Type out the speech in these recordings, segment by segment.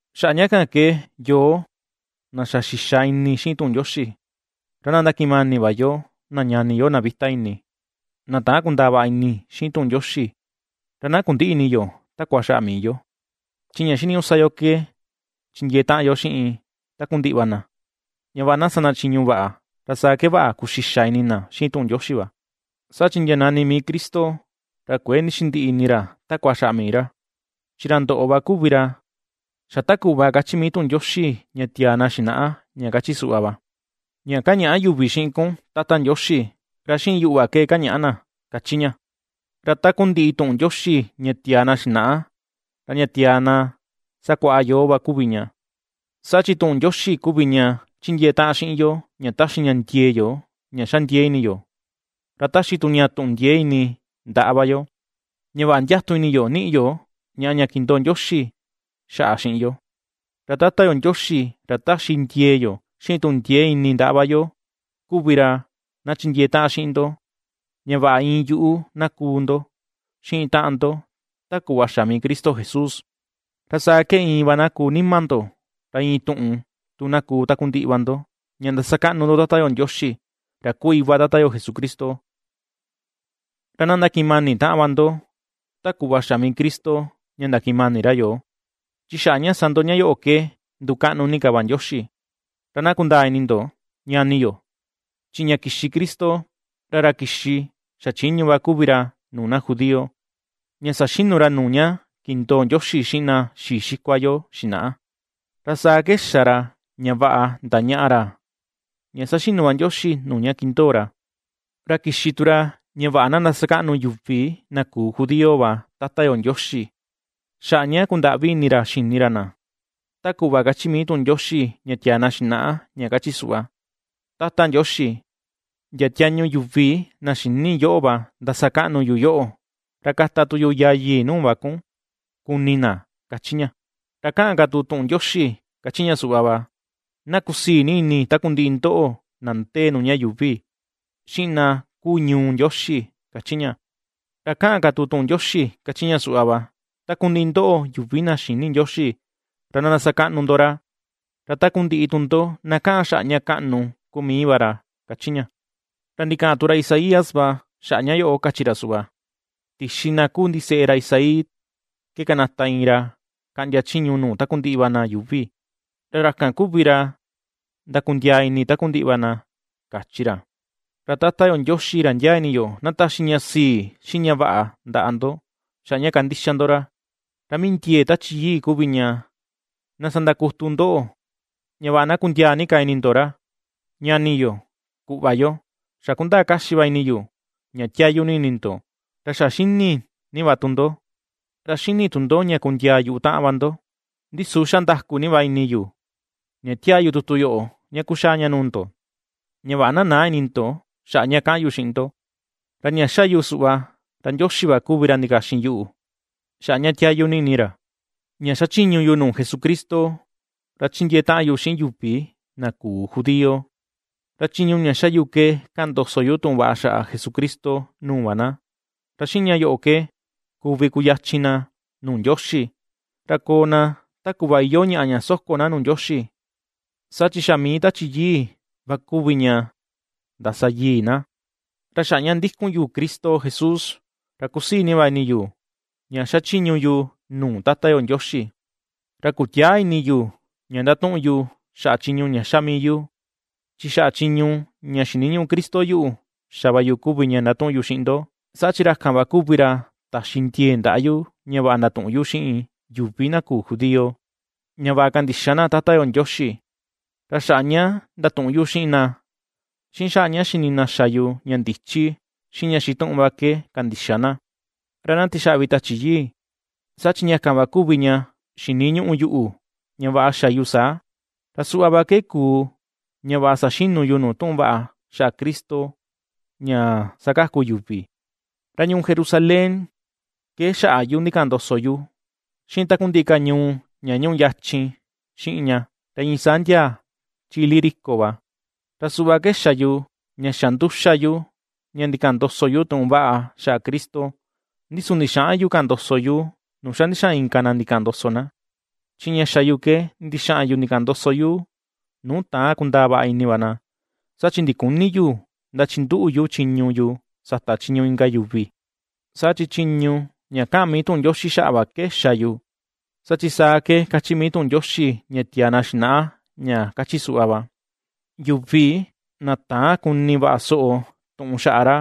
Xaꞌa ña kan ke, yoo, na xa xixa ini xiꞌin tuꞌun Ndioxi, ra na ndakiꞌin mani va yo, na ñani yo na vita ini, na täan kundaa vaꞌa ini xiꞌin tuꞌun Ndioxi, ra na kundïꞌi ini yo takua xaꞌa mii yo. Chi ña xiniñuꞌu sa yo ke chindiee taꞌan yo xiꞌin takundiꞌi va na, ña vaꞌa na sa na chiñu vaꞌa, ra saa ke vaꞌa kuxixa ini na xiꞌin tuꞌun Ndioxi va. Saa chi ndia nani mii Cristo, ra kuëe ndixindiꞌi ini ra takua xaꞌa mii ra; chi ra ndoꞌo va kuvi ra, xa ta kuꞌva kachi mii tuꞌun Ndioxi ña tiaa na xinaꞌa, ña kachi suꞌva va: “Ña kañaꞌa yuvi xiꞌin kun, Tata Ndioxi, ra xiꞌin yuꞌu va ke kañaꞌa na”, ^kachi ña. Ra takundiꞌi tuꞌun Ndioxi ña tiaa na xinaꞌa, ra ña tiaa na sakuaꞌa yoo va kuvi ña. Saa chi tuꞌun Ndioxi kuvi ña chindiee taꞌan xiꞌin yo ña taxi ña ndiee yo ña ^xa ndiee ini yo, ra taxi tu ña tuꞌun ndiee ini ndaꞌa va yo, ña vaꞌa ndiatu ini yo niꞌi yo ñaꞌa ña kindoo Ndioxi xaꞌa xiꞌin yo. Ra Tata yo Ndioxi, ra ^taxi ndiee yo, xiꞌin tuꞌun ndiee ini ndaꞌa va yo, kuvi ra na chindiee taꞌan xiꞌin ndo, ña vaꞌa iin yuꞌu na kuu ndo xiꞌin taꞌan ndo, ta kuꞌva xa mii Cristo Jesús, Ra saa ke, iin va na kuu nima ndo, ra iin tuꞌun, tu na kuu takundiꞌi va ndo ña ndasakaꞌnu ndo Tata yo Ndioxi, ra kuu Iva Tata yo Jesucristo. Ra na ndakiꞌin mani taꞌan va ndo, ta kuꞌva xa mii Cristo ña ndakiꞌin mani ra yoo, chi xaꞌa ña sa ndo ña yoꞌo ke ndukaꞌnu ni ka va Ndioxi. Ra na kundaa ini ndo ñani yo, chi ña kixi Cristo, ra ra kixi xachiñu va kuvi ra nuu na judío, ña saxinu ra nuu ña kindoo Ndioxi xiꞌin na xii xikua yo xinaꞌa, ra saa ke xa ra ña vaꞌa ndañaꞌa ra ña ^saxinu va Ndioxi nuu ña ^kindoo ra. Ra kixi tu ra, ña vaꞌa na ndasakaꞌnu yuvi na küu judío va Tata yo Ndioxi, xaꞌa ña kundaꞌvi ini ra xini ra na, ta kuꞌva kachi mii tuꞌun Ndioxi ña tiaa na xinaꞌa, ña kachi suꞌva va: Tata Ndioxi, ndia tiañu yuvi na xïni yoꞌo va ndasakaꞌnu yu yoꞌo, ra kata tu yu yaa yii nuu va kun, kuni na, ^kachi ña. Ra kaꞌan ka tu tuꞌun Ndioxi, kachi ña suꞌva va: Na kusii ni ini takundiꞌi ndoꞌo na ndee nuu ña yuuvi, xiꞌin na kuu ñuu Ndioxi, ^kachi ña. Ra kaꞌan ka tu tuꞌun Ndioxi kachi ña suꞌva va: Takundiꞌi ndoꞌo, yuvi na xïni Ndioxi, ra na ndasakaꞌnu ndo ra, ra takundiꞌi tu ndo, na kaꞌan xaꞌa ña kaꞌnu kuu mii va ra, ^kachi ña. Ra ndikaꞌan tu ra Isaías va xaꞌa ña yoꞌo, kachi ra suꞌva: Tixi na kuu ndiseꞌe ra Isaí, ke kanata iin ra kaꞌndia chiñu nuu takundiꞌi va na yuuvi; ra ra kan kuvi ra ndakundiaa ini takundiꞌi va na, kachi ra. Ra Tata yo Ndioxi, ra ndiaa ini yo, na taxi ña sii, xiꞌin ña vaꞌa ndaꞌa ndo, xaꞌa ña kandixa ndo ra; ra mii ndiee Tachi Yii kuvi ña na sandakutu ndoꞌo, ña vaꞌa na kundiaa ni ka ini ndo ra. Ñani yo, kuꞌva yo, xa kundaa kaxi va ini yu, ña tiáyú ni ini ndo, ra xa xíni̱ ni va tu ndo, ra xini tu ndo ña kondiaa yuꞌu taꞌan va ndo. Ndi su ^xa ndaku va ini yu, ña ^tiaa yu tutu yoꞌo ña kuxaa ña nuu ndo, ña vaꞌa na näa ini ndo xaꞌa ña kaꞌan yu xiꞌin ndo. Ra ña ^xa yu suꞌva, ra Ndioxi va kuvi ra ndikaxin yuꞌu xaꞌa ña tiáyú ni ini ra, ña xachiñu yu nuu Jesucristo, ra chindiee taꞌan yu xiꞌin yuvi na küu judío. Ra chiñu ña ^xa yu ke kaꞌan ndoso yu tuꞌun vaꞌa xaꞌa Jesucristo nuu va na, ra xiꞌin ña yoꞌo ke kuvi kuyachin na nuu Ndioxi, ra koo na ta kuꞌva iyoo ñaꞌa ña soko na nuu Ndioxi, saa chi xa mii Tachi Yii va kuvi ña ndasa yii na. Ra xaꞌa ña ndikun yu Cristo Jesús, ra kusii ni va ini yu ña ^xachiñu yu nuu Tata yo Ndioxi. Ra kutiäa ini yu ña ndatuꞌun yu xaꞌa chiñu ña xa mii yu, chi xaꞌa chiñu ña xiniñuꞌu Cristo yuꞌu xa va yu kuvi ña ndatuꞌun yu xiꞌin ndo xaꞌa, saa chi ra kan va kuvi ra taxi ndiee ndaꞌa yu ña vaꞌa ndatuꞌun yu xiꞌin yuvi na küu judío, ña vaꞌa kandixa na Tata yo Ndioxi. Ra xaꞌa ña ndatuꞌun yu xiꞌin na, xiꞌin xaꞌa ña xini na xa yu, ña ndichi, xiꞌin ña xituꞌun, va ke kandixa na. Ra na tixaꞌvi Tachi Yii, saa chi ña kan va kuvi ña xiniñuꞌu yuꞌu ña vaꞌa xa yu saa, ra suꞌva va ke kuu ña vaꞌa saxinu yu nuu tuꞌun vaꞌa xaꞌa Cristo ña sakaku yuvi. Ra ñuu Jerusalén ke xaꞌa yu ndikaꞌan ndoso yu xiꞌin takundiꞌi ka ñuu ña ñuꞌu yachin xiꞌin ña, ra iin saa ndia chi Ilírico va. Ra suꞌva ke xa yu ña xa nduxa yu ña ndikaꞌan ndoso yu tuꞌun vaꞌa xaꞌa Cristo, ndi su ndixäꞌan yu kaꞌan ndoso yu nuu xa ndixaꞌan inka na ndikaꞌan ndoso na, chi ña xa yu ke ndixaꞌan yu ndikaꞌan ndoso yu nuu täan kundaa vaꞌa ini va na, saa chi ndiküni yu ndachinduꞌu yu chiñu yu sata chiñu inka yuvi. Saa chi chiñu ña kaꞌan mii tuꞌun Ndioxi xaꞌa va ke xa yu, saa chi saa ke kachi mii tuꞌun Ndioxi ña tiaa na xinaꞌa ña kachi suꞌva va: Yuvi na täan kuni vaꞌa soꞌo tuꞌun xaꞌa ra,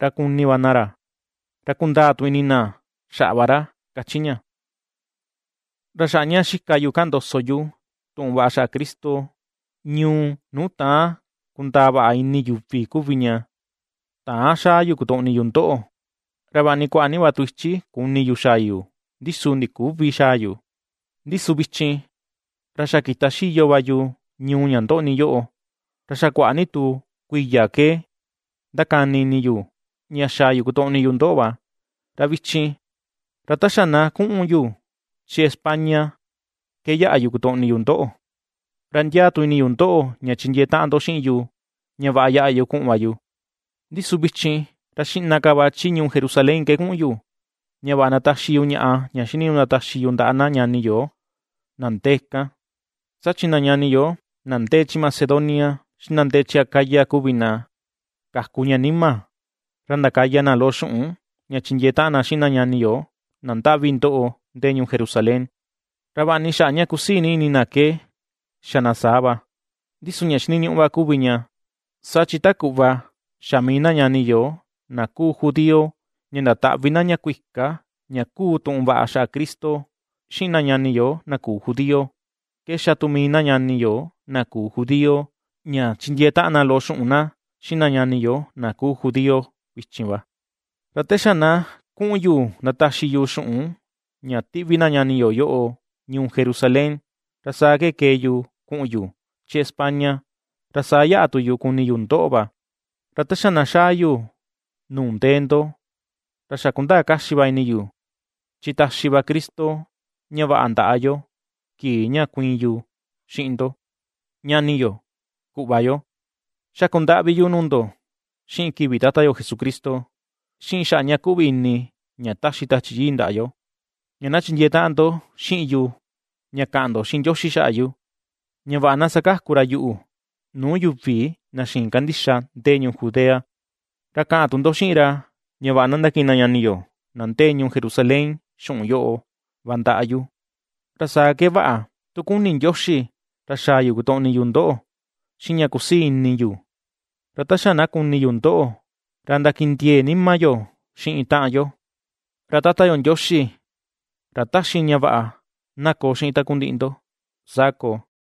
ra kuni va na ra, ra kundaa tu ini na xaꞌa va ra, ^kachi ña. Ra xaꞌa ña xika yu kaꞌan ndoso yu tuꞌun vaꞌa xaꞌa Cristo ñuu nuu täan kundaa vaꞌa ini yuvi kuvi ña, täan xaa yu kutoꞌni yu ndoꞌo. Ra vaꞌa ni kuaꞌa ni va tu ichi kuni yu xaa yu ndi su ndiküvi xaa yu. Ndi su vichin, ra xa kita xiyo va yu ñuu ña ndoꞌni yoꞌo, ra xa kuaꞌa ni tu kuiya ke ^ndakani ini yu ña xaa yu kutoꞌni yu ndoꞌo va, ra vichin, ra ta xa na kuꞌun yu chi España ke yaꞌa yu kutoꞌni yu ndoꞌo, ra ndiaa tu ini yu ndoꞌo ña chindiee taꞌan ndo xiꞌin yu ña vaꞌa yaꞌa yu kuꞌun va yu. Ndi su vichin, ra xiꞌna ka va chi ñuu Jerusalén ke kuꞌun yu, ña vaꞌa ndataxi yu ñaꞌa ña xiniñuꞌu ndataxi yu ndaꞌa na ñani yo na ndee kan. Saa chi na ñani yo na ndee chi Macedonia, xiꞌin na ndee chi Acaya kuvi na kaku ña nima, ra ndakaya na loꞌo xuꞌun, ña chindiee taꞌan na xiꞌin na ñani yo na ndaꞌvi ndoꞌo ndee ñuu Jerusalén. Ra vaꞌa ni xaꞌa ña kusii ini na ke xa na saa va, ndi su ña xiniñuꞌu va kuvi ña, saa chi ta kuꞌva xa mii na ñani yo na kuu judío ña ndataꞌvi na ña kuika ña kuu tuꞌun vaꞌa xaꞌa Cristo xiꞌin na ñani yo na küu judío, ke ^xa tu mii na ñani yo na küu judío ña chindiee taꞌan na loꞌo xuꞌun na, xiꞌin na ñani yo na kuu judío vichin va. Ra te xa na kuꞌun yu ndataxi xuꞌun ña tiꞌvi na ñani yo yoꞌo ñuu Jerusalén, ra saa ke kee yu kuꞌun yu chi España, ra saa yaꞌa tu yu kuni yu ndoꞌo va. Ra ta xa na xaa yu nuu ndee ndo, ra xa kundaa kaxi va ini yu chi taxi va Cristo ña vaꞌa ndaꞌa yo kii ña kuiin yu xiꞌin ndo. Ñani yo, kuꞌva yo, xaku ndaꞌvi yu nuu ndo xiꞌin kivi Tata yo Jesucristo, xiꞌin xaꞌa ña kuꞌvi ini ña ^taxi Tachi Yii ndaꞌa yo, ña na chindiee taꞌan ndo xiꞌin yu ña kaꞌan ndo xiꞌin Ndioxi xaꞌa yu, ña vaꞌa na sakaku ra yuꞌu nuu yuvi na xïin kandixa ndee ñuu Judea, ra kaꞌan tu ndo xiꞌin ra, ña vaꞌa na ndakiꞌin na ñani yo na ndee ñuu Jerusalén xuꞌun yoꞌo va ndaꞌa yu. Ra saa ke vaꞌa, tu kuni Ndioxi ra xaa yu kutoꞌni yu ndoꞌo xiꞌin ña kusii ini yu, ra ta xa na kuni yu ndoꞌo, ra ndakindiee nima yo xiꞌin taꞌan yo. Ra Tata yo Ndioxi ra ^taxi ña vaꞌa, na koo xiꞌin takundiꞌi ndo. Saa koo.